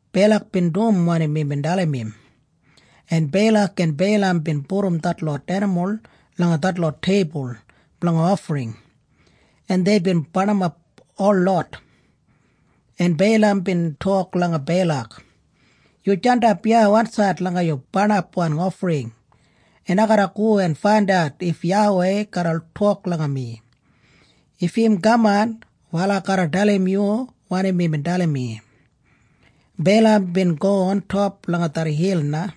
Beilak bin dum wanim imbin dalim im, en Beilak en Beilam bin pudum detlot enimul langa detlot teibul blanga ofring en deibin barnimap holot. En Beilam bin tok langa Beilak, “Yu jandap iya wansaid langa yu barnapwan ofring, en ai garra go en faindat if YAWEI garra tok langa mi. If im kaman, wal ai garra dalim yu wanim imbin dalim mi.” Beilam bin go ontop langa det hil na,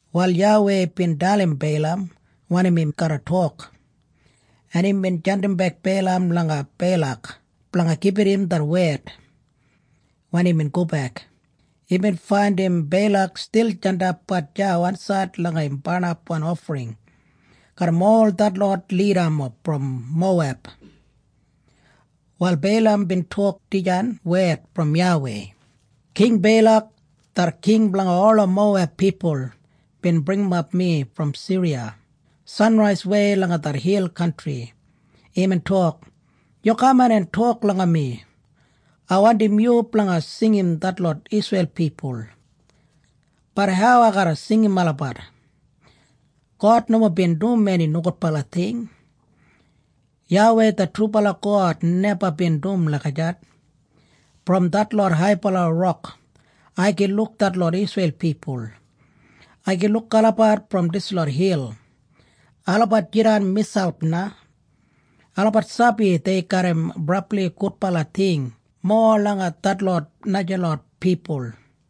Wal YAWEI bin dalim Beilam wanim im garra tok, en imbin jandimbek Beilam langa Beilak blanga gibit im det wed. Wen imbin gobek, imbin faindim Beilak stil jandapbat deya wansaid langa im barnapwan ofring garram ol detlot lidamob brom Moweb. Wal Beilam bin tok dijan wed brom YAWEI, “King Beilak, det king blanga ola Moweb pipul bin bringimap mi brom Siriya, sanraiswei langa det hil kantri. Imbin tok, ‘Yu kaman en tok langa mi. Ai wandim yu blanga singim detlot Isreil pipul.’ Bat hau ai garra singim olabat? God nomo bin dum eni nogudbala ting. YAWEI det trubala God neba bin dum lagijat. Brom detlot haibala rok ai gin luk detlot Isreil pipul. Ai gin luk olabat brom dislot hil. Olabat jidan miselp na. Olabat sabi dei garram brabli gudbala ting mowa langa detlot najalot pipul.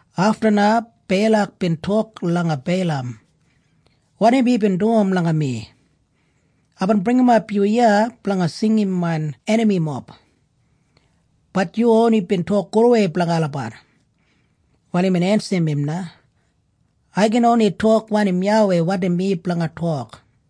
Afta na Beilak bin tok langa Beilam, “Wanim yubin dum langa mi? Aibin bringimap yu iya blanga singim main enamimob, bat yu oni bin tok gudwei blanga olabat.” Wal imbin ensim im na, “Ai gin oni tok wanim YAWEI wandim mi blanga tok.”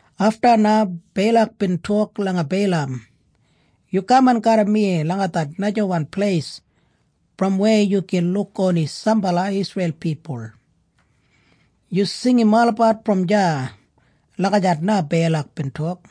Afta na Beilak bin tok langa Beilam, “Yu kaman garram mi langa det najawan pleis brom weya yu gin luk oni sambala Isreil pipul. Yu singim olabat brom deya.” Lagijat na Beilak bin tok.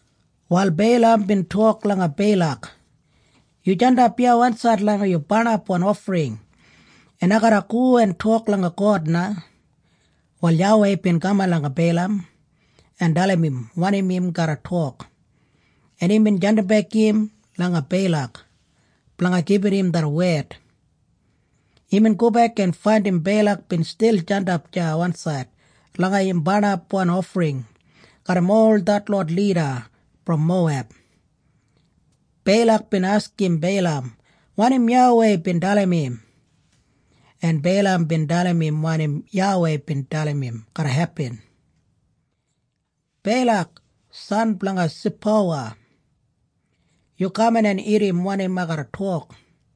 Wal Beilam bin tok langa Beilak, “Yu jandap iya wansaid langa yu barnapwan ofring, en ai garra go en tok langa God na.” Wal YAWEI bin kaman langa Beilam en dalim im wanim im garra tok, en imbin jandimbek im langa Beilak blanga gibit im det wed. Imbin gobek en faindim Beilak bin stil jandap deya wansaid langa im barnapwan ofring garram ol detlot lida brom Moweb. Beilak bin askim Beilam wanim YAWEI bin dalim im. En Beilam bin dalim im wanim YAWEI bin dalim im garra hepin. “Beilak, san blanga Sipowa, yu kaman en irrim wanim ai garra tok.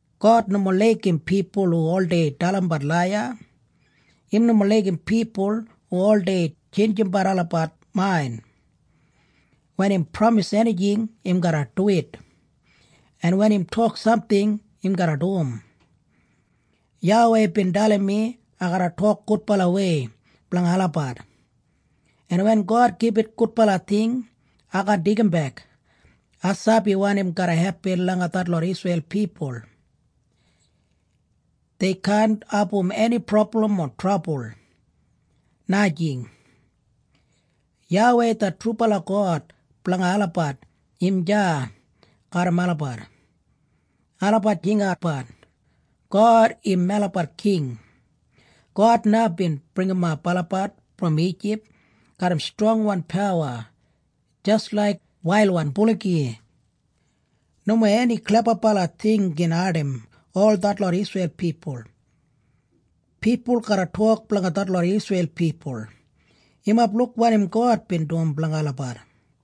God nomo laigim pipul hu oldei dalimbat laiya. Im nomo laigim pipul hu oldei tjeinjimbat olabat main. Wen im pramis enijing, im garra duwit. En wen im tok samting, im garra dum. YAWEI bin dalim mi ai garra tok gudbalawei blanga olabat. En wen God gibit gudbala ting, ai kaan deigimbek. Ai sabi wanim garra hepin langa detlot Isreil pipul. Dei kaan abum eni prablam o trabul, najing. YAWEI det trubala God blanga olabat im deya garram olabat. Olabat jingatbat, ‘God im melabat king!’ God na bin bringimat olabat brom Ijip garram strongwan pawa jis laik wailwan buligi. Nomo eni klebabala ting gin ardim ol detlot Isreil pipul. Pipul garra tok blanga detlot Isreil pipul, ‘Yumob luk wanim God bin dum blanga olabat!’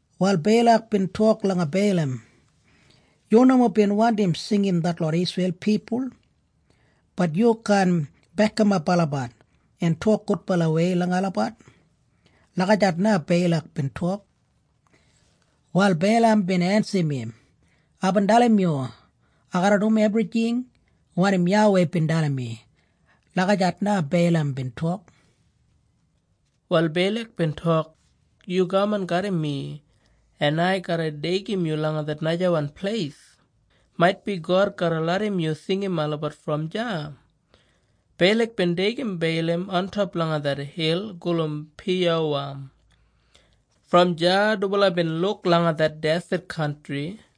Wal Beilak bin tok langa Beilam, “Yu nomo bin wandim singim detlot Isreil pipul, bat yu kaan bekimap olabat en tok gudbalawei langa olabat.” Lagijat na Beilak bin tok. Wal Beilam bin ensim im, “Aibin dalim yu, ai garra dum ebrijing wanim YAWEI bin dalim mi.” Lagijat na Beilam bin tok. Wal Beilak bin tok, “Yu kaman garram mi, en ai garra deigim yu langa det najawan pleis. Maitbi God garra larram yu singim olabat brom deya.” Beilak bin deigim Beilam ontop langa det hil gulum Piyowa. Brom deya dubala bin luk langa det deset kantri.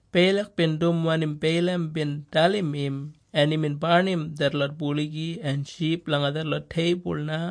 Beilak bin dum wanim Beilam bin dalim im en imbin barnim detlot buligi en ship langa detlot teibul na.